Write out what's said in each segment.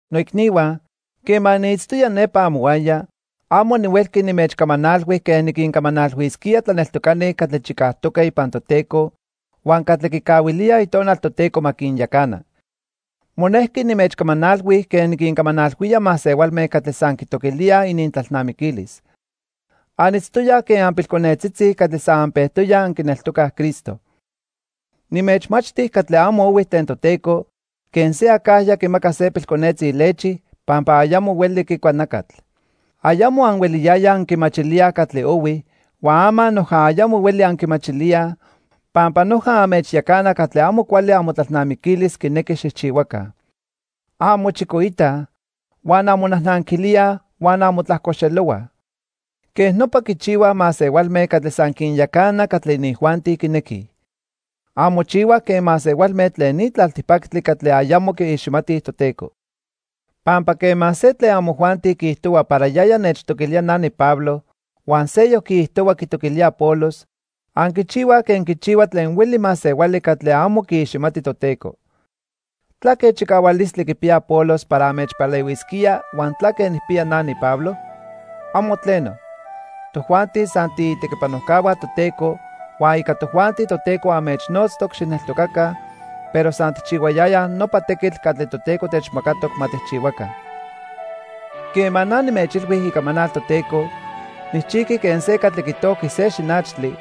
Noicnihua, quema niitztoya nepa amohuaya, amo nihuelqui nimechcamanalhui quen niquincamanalhuisquía tlaneltocani catli chicajtoque ipan Toteco huan catli quicahuilíaj Itonal Toteco ma quinyacana. Monejqui nimechcamanalhui quen niquincamanalhuía masehualme catli san quitoquilíaj inintlalnamiquilis. Anitztoyaj quen anpilconetzitzi catli san anpejtoyaj anquineltocaj Cristo. Nimechmachti catli amo ohui tlen Toteco, quen se acajya quimaca se pilconetzi lechi pampa ayamo hueli quicua nacatl. Ayamo anhueliyayaj anquimachilíaj catli ohui, huan ama noja ayamo hueli anquimachilíaj, pampa noja anmechyacana catli amo cuali amotlalnamiquilis quinequi xijchihuaca. Anmochicoitaj, huan anmonajnanquilíaj huan anmotlajcoxelohuaj. Quej nopa quichihuaj masehualme catli san quinyacana catli inijuanti quinequij. Anmochihuaj quen masehualme tlen ni tlaltipactli catli ayamo quiiximatij Toteco. Pampa quema se tlen amojuanti quiijtohua para yaya nechtoquilía na niPablo, huan seyoc quiijtohua quitoquilía Apolos, anquichihuaj quen quichihua tlen hueli masehuali catli amo quiiximati Toteco. ¿Tlaque chicahualistli quipiya Apolos para anmechpalehuisquía huan tlaque nijpiya na, niPablo? ¡Amo tleno! Tojuanti san tiitequipanojcahua Toteco huan ica tojuanti Toteco anmechnotztoc xijneltocaca, pero san tijchihuayayaj nopa tequitl catli Toteco techmacatoc ma tijchihuaca. Quema na nimechilhui icamanal Toteco, nijchijqui quen se catli quitojqui se xinachtli,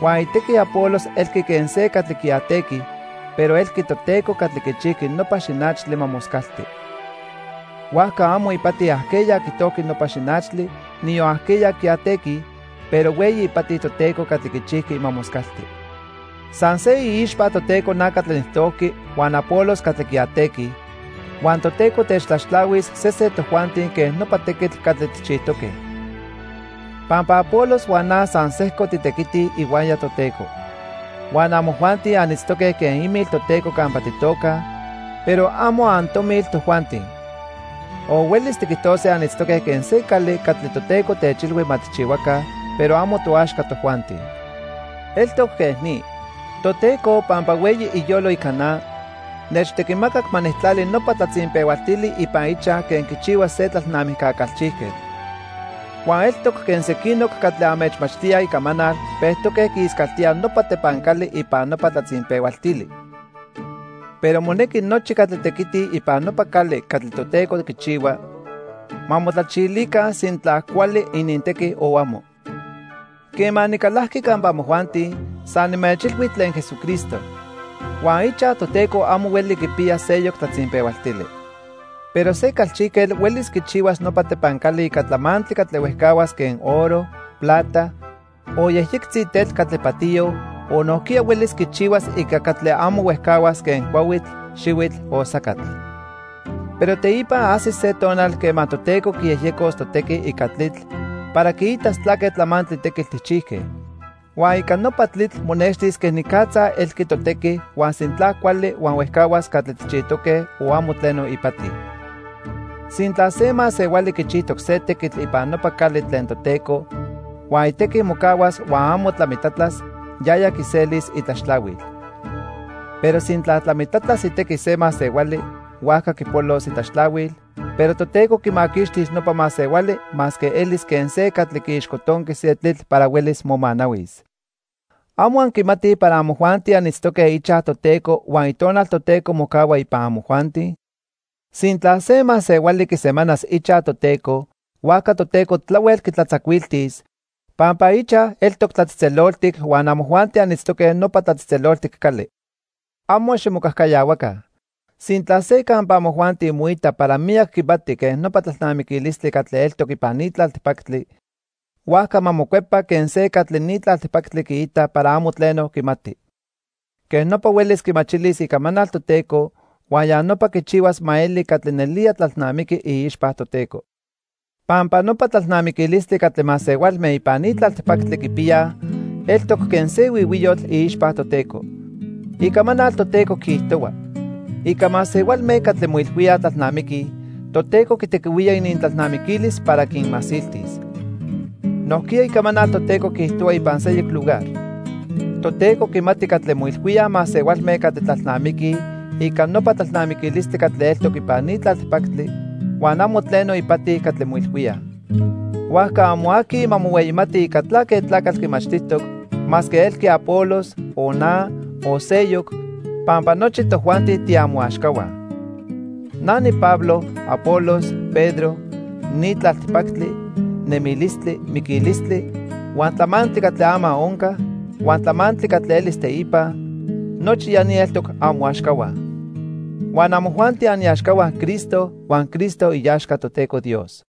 huan itequi Apolos elqui quen se catli quiatequi, pero elqui Toteco catli quichijqui nopa xinachtli ma moscalti. Huajca amo ipati ajqueya quitojqui nopa xinachtli, niyon ajqueya quiatequi, pero hueyi ipati Toteco catli quichijqui ma moscalti. San se iixpa Toteco na catli nijtojqui huan Apolos catli quiatequi, huan Toteco techtlaxtlahuis sesen tojuanti quen nopa tequitl catli tijchijtoque. Pampa Apolos huan na san sejco titequitij ihuaya Toteco. Huan amojuanti anitztoque quen imil Toteco campa titocaj, pero amo antomil tojuanti. O huelis tiquijtose anitztoque quen se cali catli Toteco techilhui ma tijchihuaca, pero amo toaxca tojuanti. Eltoc quej ni. Toteco, pampa hueyi iyolo ica na, nechtequimacac ma nijtlali nopa tlatzinpehualtili ipan ichaj quen quichihua se tlalnamijca calchijquetl. Huan eltoc quen sequinoc catli anmechmachtíaj Icamanal pejtoque quiiscaltíaj nopa tepancali ipan nopa tlatzinpehualtili. Pero monequi nochi catli tequitij ipan nopa cali catli Toteco quichihua, ma motlachilica sintla cuali inintequi o amo. Quema nicalajqui campa amojuanti, san nimechilhui tlen Jesucristo. Huan ichaj Toteco amo hueli quipiya seyoc tlatzinpehualtili. Pero se calchijquetl huelis quichihuas nopa tepancali ica tlamantli catli huejcahuas quen oro, plata, o yejyectzi tetl catli patiyo, o nojquiya huelis quichihuas ica catli amo huejcahuas quen cuahuitl, xihuitl o sacatl. Pero teipa ajsis se tonal quema Toteco quiyejyecos totequi ica tlitl para quiitas tlaque tlamantli tequitl tijchijque. Huan ica nopa tlitl monextis quenicatza elqui totequi huan sintla cuali huan huejcahuas catli tijchijtoque o amo tleno ipati. Sintla se masehuali quichijtoc se tequitl ipan nopa cali tlen Toteco huan itequi mocahuas huan amo tlamitlatlas, yaya quiselis itlaxtlahuil. Pero sintla tlamitlatlas itequi se masehuali, huajca quipolos itlaxtlahuil, pero Toteco quimaquixtis nopa masehuali masque elis quen se catli quiixcotonqui se tlitl para huelis momanahuis. ¿Amo anquimatij para amojuanti anitztoque ichaj Toteco huan Itonal Toteco mocahua ipan amojuanti? Sintla se masehuali quisemanas ichaj Toteco, huajca Toteco tlahuel quitlatzacuiltis, pampa ichaj eltoc tlatzejtzeloltic huan amojuanti anitztoque nopa tlatzejtzeloltic cali. Amo ximocajcayahuaca. Sintla se campa amojuanti moita para miyac quimati quen nopa tlalnamiquilistli catli eltoc ipan ni tlaltipactli, huajca ma mocuepa quen se catli ni tlaltipactli quiita para amo tleno quimati. Quej nopa huelis quimachilis Icamanal Toteco huan ya nopa quichihuas ma eli catli nelía tlalnamiqui iixpa Toteco. Pampa nopa tlalnamiquilistli catli masehualme ipan ni tlaltipactli quipiyaj eltoc quen se huihuiyotl iixpa Toteco. Icamanal Toteco quiijtohua: "Ica masehualme catli moilhuíaj tlalnamiquij, Toteco quitequihuía inintlalnamiquilis para quinmasiltis." Nojquiya Icamanal Toteco quiijtohua ipan seyoc lugar: "Toteco quimati catli moilhuíaj masehualme catli tlalnamiquij ica nopa tlalnamiquilistli catli eltoc ipan ni tlaltipactli, huan amo tleno ipati catli moilhuíaj." Huajca amo aqui ma mohueyimati ica tlaque tlacatl quimachtijtoc, masque elqui Apolos, o na, o seyoc, pampa nochi tojuanti tiamoaxcahua. Na niPablo, Apolos, Pedro, ni tlaltipactli, nemilistli, miquilistli, huan tlamantli catli ama onca, huan tlamantli catli elis teipa; nochi ya ni eltoc amoaxcahua. Huan amojuanti aniaxcahua Cristo huan Cristo iaxca Toteco Dios.